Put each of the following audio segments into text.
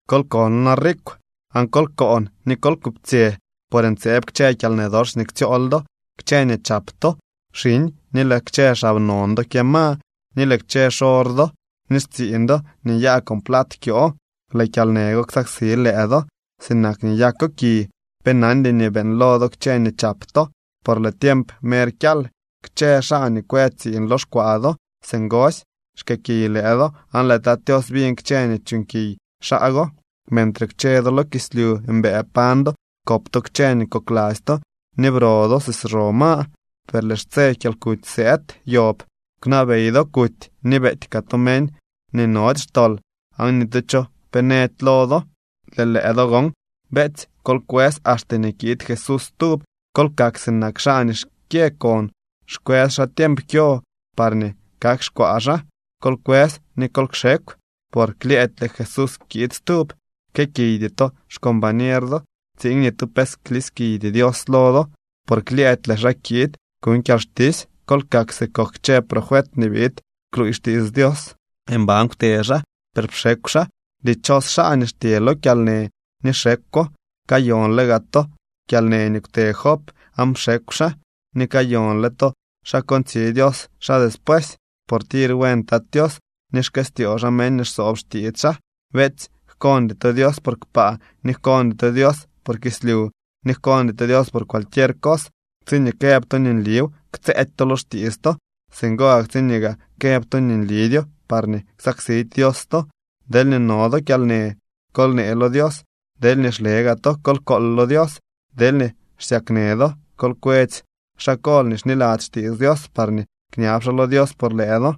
¡Kol kono na rikw!, aan kol koon ni kol kuptsyë por ntseeb kchë kyalnë dox nii ktsyool do. Kchë nii chap to xiñ, ni lëë kchë xab non do kyëma. Ni lëë kchë xor do ni xtsiiñ do nii nyaa con plat kyoo. Lëë kyalnë go ksaksi lëë do sinak nii nyako ki. Pe nandy nii beeñlo do kchë nii chap to, por lëë tiemp mer kyal. Kchë xaa nii kwë tsiiñ lo xkwaa do singosy xkëëkiy lëë do aan lëë Tat Tios biñ kchë nii chuuñkiy xaa go. Mentre kwche do lo kislyu mbëë pañ do, kop to kchë nii kokladzy to, ni bro do si xro ma. Per lëë xtse kyalkuty sëëd yob. Kwnabey do kuty ni beety kaa to meñ nii nody xtol aan ni tu cho pe nëdy lo do. Lëë lëë do gon, beetsy, kol kwës axte nii kiid Jesús stub. Kol kak sinak xaa nii xkyë kon, xkwës xaa xtiemp kyo parñee kak xkwaa xaa. Kol kwës ni kol kxekw, por klyëëdy lëë Jesús kiid stub. Jkëëkiydy to xcombañer do, tsiin ni tu pe kliskiydy Dios lo do, por klyëëdy lëë xaa kiid kuñ kyalxtisy. Kol kak si kok kchë profet nii biid kluuy xtiits Dios. Mban kwte xaa, per pxekw xaa. Dichos xaa nii xtye lo kyalnë ni xekwo. Kayonle gaa to kyalnë nii kwte Job aan pxekw xaa, ni kayonle to xa kontsi Dios xaa despuesy, por tir buen Tat Tios ni xkëstyoo xaa meñ nii xsoob xtiits xaa. Beetsy, jkoondy to Dios por kpaa, ni jkoondy to Dios por kislyu, ni jkoondy to Dios por cualquier cos. Tsiñee këb to nii nliw, ktsëëdy to lo xtiits to. Singo gak tsiñee gaa këb to nii nlidyo, parñee ksaksidy Dios to. Deelñee no do kyalnë, kol nee lo Dios. Deelñee xle gaa to kol kool lo Dios. Deelñee xsyaknë do, kol kwetsy xaa kol nii xniladzy xtiits Dios parñee kñab xaa lo Dios por lëë do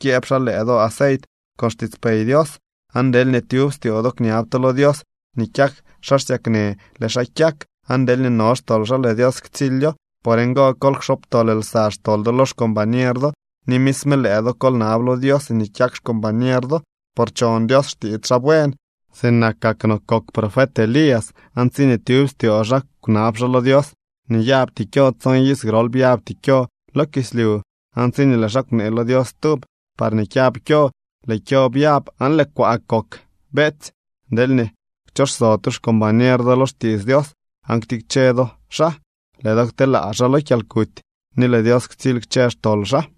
kyëëb xaa lëë do aceit con xtiitspey Dios. Aan deelñee tyub styoo do kñab to lo Dios nii kyak xaa xsyaknë, lëë xaa kyak. Aan deelñee no xtol xaa lëë Dios ktsilyo. Por ngo, kol kxobtol lsa xtol do lo xcombañer do, ni misme lëë do kol nab lo Dios nii kyak xcombañer do. Por chon Dios xtiits xaa buen. Sinakak no kok profet Elías, aan tsiñee tyub styoo xaa kwnab xaa lo Dios nii nyabty kyo, tson iz grol byabty kyo lo kislyu. Aan tsiñee lëë xaa kwnee lo Dios stub, parñee kyab kyo, lëë kyo byab aan lëë kwaa kok. Beetsy, deelñee kchoxso tu xcombañer do lo xtiits Dios aan ktikche do xaa, lëë do kteelaa xaa lo kyalkuty ni lëë Dios ktsily kchë xtol xaa.